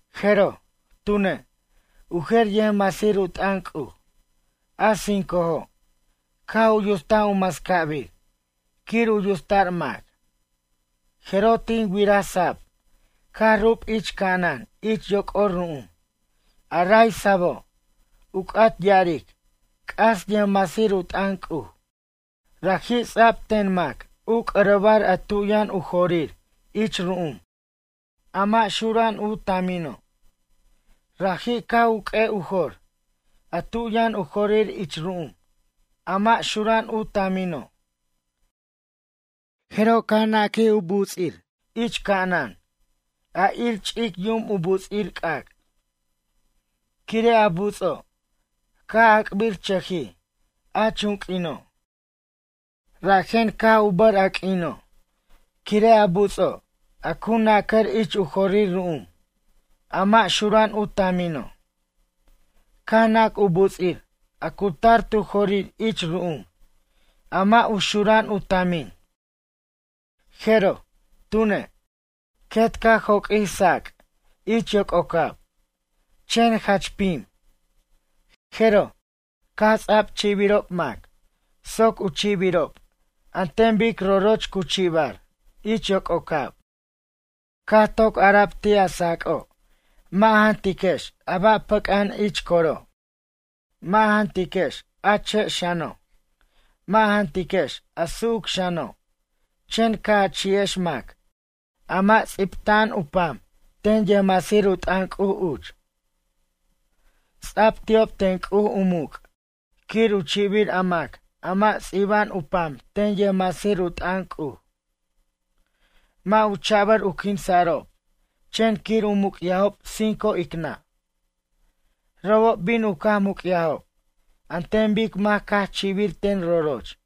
Jeroj, tune', u jer yʌjmasir u t'ʌn C'uj, a cincojo', caj u yutst u mascabir quir u yutsta'r mac. Jeroj tin wiraj sab caj rub ich ca'anan ich yoc'or ru'um, a ray sabo' u c'at ya'aric c'as yʌjmasir u t'ʌn C'uj. Raji' ts'a'b ten mac u c'ʌrʌbar a tu yʌn u jorir ich ru'um, a mʌ' u xura'an u tamino'. Raji' caj u q'ue' u jor a tu yʌn u jorir ich ru'um a mʌ' u xura'an u tamino', jeroj caj naquij u buts'ij ich ca'anan a ir ch'ic yum u buts'ir c'ac'. Quire' a buts'o' caj ac'birchʌjij a chunq'uino', rajen caj u bʌr a q'uino' quire' a buts'o', a cu nacʌr ich u jorir ru'um, a mʌ' xura'an u tamino'. Caj nac u buts'ir a cu tar tu jorir ich ru'um a mʌ' u xura'an u tamin. Jeroj, tune', quet caj joq'uij sa'ac' ich yoc'ocab, chen jach pim. Jeroj, caj ts'a'b chi'biro' mac soc u chi'birob an ten bic roroch cu chi'bar ich yoc'ocab. Caj toc ara'b ti' a sa'ac'o' mʌ' a jantiquex a ba' pʌc'a'an ich coro', mʌ' a jantiquex a che' xano', mʌ' a jantiquex a su'uc xano' chen ca' a chi'ex mac a mʌ' ts'ibta'an u pam ten yʌjmasir u t'ʌn C'uj uch. Ts'a'b ti'ob ten C'uj u muc' quir u chi'bir a mac a mʌ' ts'iba'an u pam ten yʌjmasir u t'ʌn C'uj. Mʌ' u cha'bʌr u quinsa'rob chen quir u muc'yajob cinco ic nʌ'. Robob bin u caj muc'yajob an ten bic mac caj chi'bir ten roroch.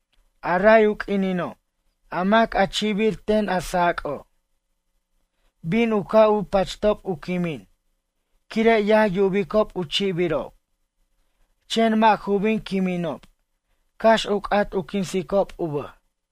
A ray u q'uinino', a mac a chi'bir ten a sa'ac'o', bin u ca' u pachtob u quimin quire' yaj yubicob u chi'birob, chen mʌ' ju bin quiminob cax u c'at u quinsicob u bʌj.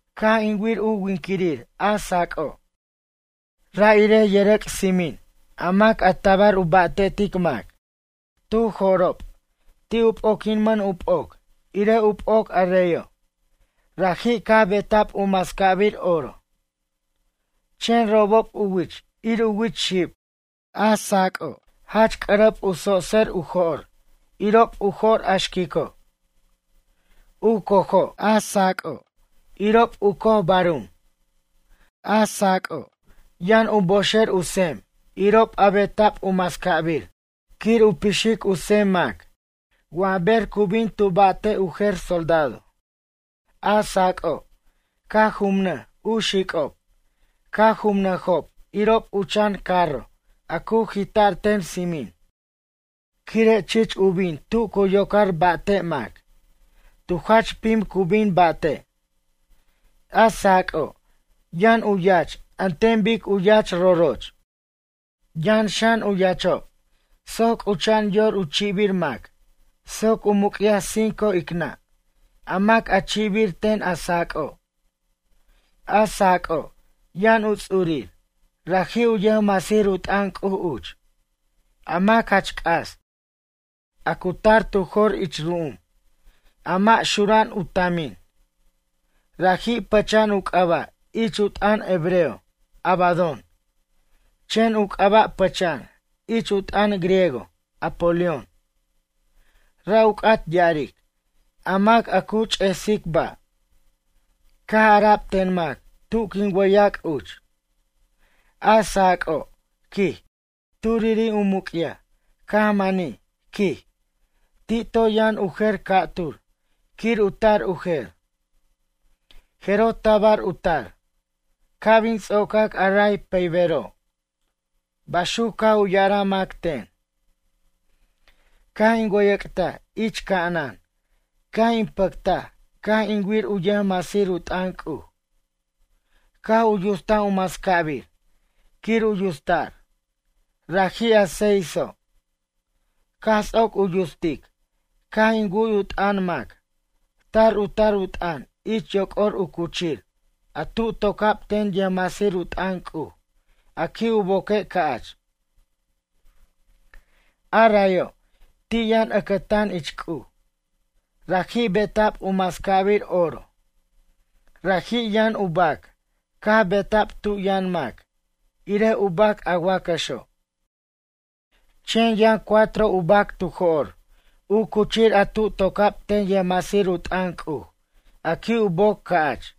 Caj in wir u winquirir a sa'ac'o', ra' irej yʌrʌc' tsimin a mac a tabar u ba'tetic mac. Tu jo'rob ti' u p'oquimʌn u p'oc irej u p'oc a reyo', raji' caj beta'b u mascabir oro. Chen robob u wich ir u wich xib. A sa'ac'o', jach c'ʌrʌb u tsotser u jo'r irob u jo'r a xquico'. U cojo' a sa'ac'o', irob u coj barum. A sa'ac'o', yʌn u boxer u tsem irob a beta'b u mascab quir u pixic u tsem mac wa ber cu bin tu ba'te' u jer soldado. A sa'ac'o', caj jumnʌj u xic'ob, caj jumʌjob irob u chan carro a cu jita'r ten tsimin quire' chich u bin tu cu yocar ba'te' mac, tu jach pim cu bin ba'te' A sa'ac'o', yʌn u yach an ten bic u yach roroch. Yʌn xan u yachob soc c'ucha'an yor u chi'bir mac soc u muc'yaj cinco ic nʌ' a mac a chi'bir ten a sa'ac'o'. A sa'ac'o', yʌn u ts'urir, raji' u yʌjmasir u t'ʌn C'uj uch, a mac jach c'as, a cu tar tu jor ich ru'um, a mʌ' xura'an u tamin. Raji' pʌcha'an u c'aba' ich u t'ʌn hebreo Abadón, chen u c'aba' pʌcha'an ich u t'ʌn griego Apolión. Ra' u c'at ya'aric, a mac a cu ch'esic ba'. Caj ara'b ten mac tu quin wʌyac' uch: “A sa'ac'o', quij, turiri' u muc'yaj caj manij, quij, ti' toy yʌn u jer ca'tur quir u tar u jer. Jeroj tabar u tar, ca' bin ts'ocac a ray pʌybero'.” Baxuc caj u ya'araj mac ten. Caj in wʌyʌc'taj ich ca'anan caj in pʌctaj caj in wir u yʌjmasir u t'ʌn C'uj, caj u yutst u mascabir quir u yutsta'r, raji' a seiso'. Caj ts'oc u yutstic caj in wu'y u t'ʌn mac tar u tar u t'ʌn ich yoc'or u cuchir a tu toca'b ten yʌjmasir u t'ʌn C'uj a qui' u boque' ca'ch. A rayo' ti' yʌn ʌcʌtan ich C'uj, raji' beta'b u mascabir oro, raji' yʌn u bac caj beta'b tu yʌn mac irej u bac a wacʌxo'. Chen yʌn cuatro u bac tu jo'r u cuchir a tu toca'b ten yʌjmasir u t'ʌn C'uj a qui' u boc ca'ch.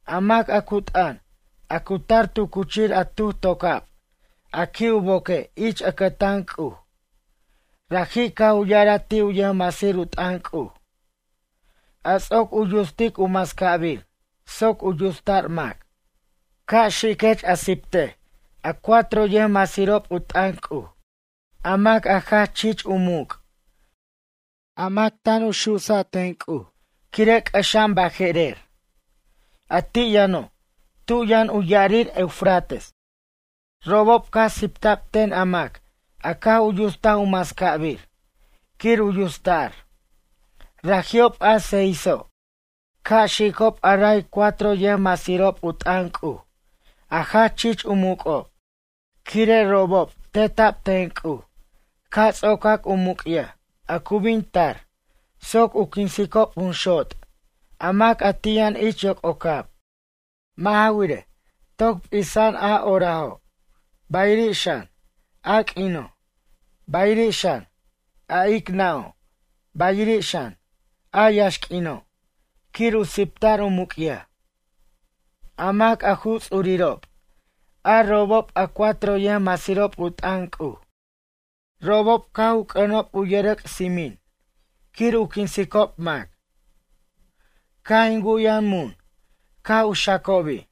A mac a cu t'ʌn, a cu tar tu cuchir a tuj toca'b a qui' u boque' ich ʌcʌtan C'uj, raji' caj u ya'araj ti' u yʌjmasir u t'ʌn C'uj, a ts'oc u yutstic u mascabir soc u yutsa'r mac: ―Ca' xiquech a siptej a cuatro yʌjmasirob u t'ʌn C'uj, a mac a jach chich u muc', a mac tan u susa' ten C'uj quire' c'ʌxa'an baje'rer, a ti' yʌno' tu yʌn u ya'arir Eufrates. Robob caj sipta'b ten a mac a caj u yutstaj u mascabir quir u yutsta'r, raji'ob a seiso', ca' xicob a raj cuatro yʌjmasirob u t'ʌn C'uj a jach chich u muc'ob. Quire' robob teta'b ten C'uj ca' ts'ocac u muc'yaj a cu bin tar soc u quinsicob jun xot' a mac a ti' yʌn ich yoc'ocab. Mʌ' ja wirej, toc p'isa'an a horajo', bayiri' xan, a q'uino', bayiri' xan, a ic nʌ'o' bayirir xan, a yaxq'uino' quir u sipta'r u muc'yaj. A mac a ju ts'urirob, a robob a cuatro yʌjmasirob u t'ʌn C'uj, robob caj u c'ʌnob u yʌrʌc' tsimin quir u quinsicob mac. Caj in wu'yaj mun caj u xacobi',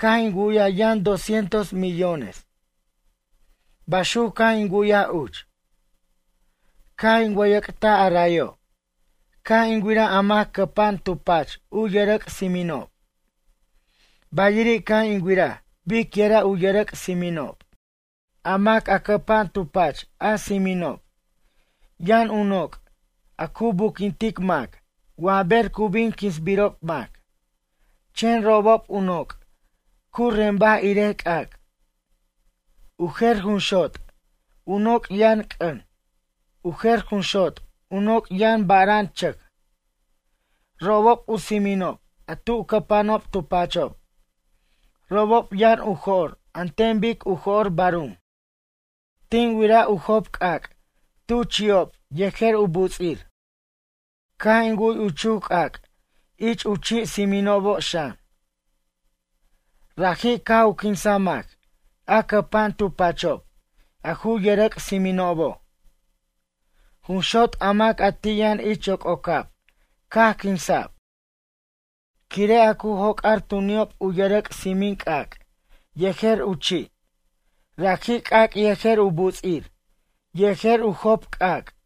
caj in wu'yaj yʌn doscientos millones. Bayuc caj in wu'yaj uch. Caj in wʌyʌc'taj a rayo', caj in wiraj a mac cʌpa'an tu pach u yʌrʌc' tsiminob, bayiri' caj in wiraj biquira' u yʌrʌc' tsiminob. A mac a cʌpa'an tu pach a tsiminob yʌn u noc' a cu buquintic mac wa ber cu bin quinsbirob mac. Chen robob u noc' cu rembaj irej c'ac'. U jer jun xot' u noc' yʌn c'ʌn, u jer jun xot' u noc' yʌn bara'an chʌc. Robob u tsiminob a tu cʌpa'anob tu pachob, robob yʌn u jo'r an ten bic u jo'r barum. Tin wiraj u job c'ac' tu chi'ob yejer u buts'ir. Caj in wu'y u chuj c'ac' ich u chi' tsiminobo' xan. Raji' caj u quinsa mac a cʌpa'an tu pachob a ju yʌrʌc' tsiminobo'. Jun xot' a mac ti' yʌn ich yoc'ocab caj quinsa'b, quire' a cu joc'ar tu ni'ob u yʌrʌc' tsimin c'ac' yejer u chi', raji' c'ac' yejer u buts'ir yejer u job c'ac'.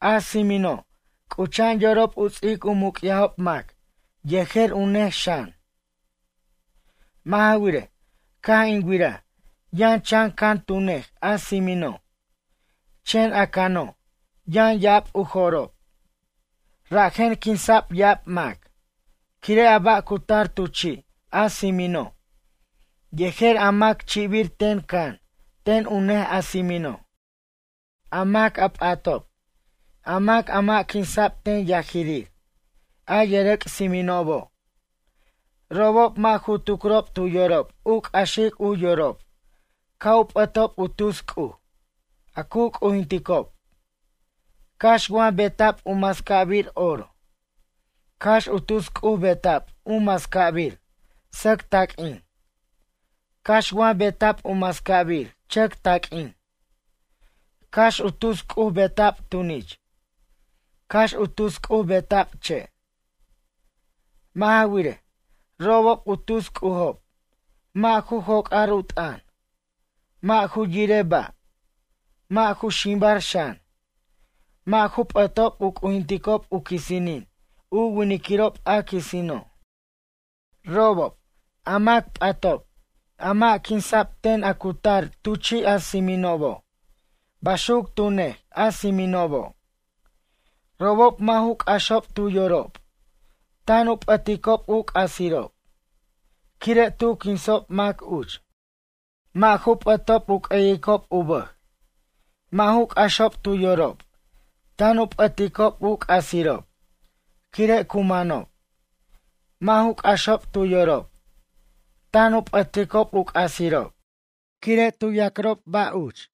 A tsimino' c'ucha'an yorob u ts'ic muc'yajob mac yejer u nej xan. Mʌ' ja wirej, caj in wiraj yʌn chan can tu nej a tsimino', chen a cano' yʌn ya'ab u jo'rob. Rajen quinsa'b ya'ab mac quire' a ba' cu tar tu chi' a tsimino', yejer a mac chi'bir ten can ten u nej a tsimino'. A mac a p'atob, a mac a mʌ' quinsa'b ten yajirir a yʌrʌc' tsiminobo', robob mʌ' ju tucrob tu yorob u c'axic u yorob ca' u pʌtob u tus c'uj a cu c'ujinticob, cax wa beta'b u mascabir oro, cax u tus c'uj beta'b u mascabir sʌc taq'uin, cax wa beta'b u mascabir chʌc taq'uin, cax u tus c'uj beta'b tunich, cax u tus c'uj beta'b che'. Mʌ' ja wirej, robob u tus c'ujob mʌ' ju joc'ar u t'ʌn, mʌ' ju yire ba', mʌ' ju ximbar xan, mʌ' ju p'ʌtob u c'ujinticob u quisinin u winiquirob a quisino'. Robob, a mac p'atob a mʌ' quinsa'b ten a cu tar tu chi' a tsiminobo' baxuc tu nej a tsiminobo', robob mʌ' ju c'axob tu yorob tan u p'ʌticob u c'asirob quire' tu quinsob mac uch, mʌ' ju p'ʌtob u c'ʌyicob u bʌj. Mʌ' ju c'axob tu yorob tan u p'ʌticob u c'asirob quire' cu manob, mʌ' ju c'axob tu yorob tan u p'ʌticob u c'asirob quire' cu ya'crob ba' uch.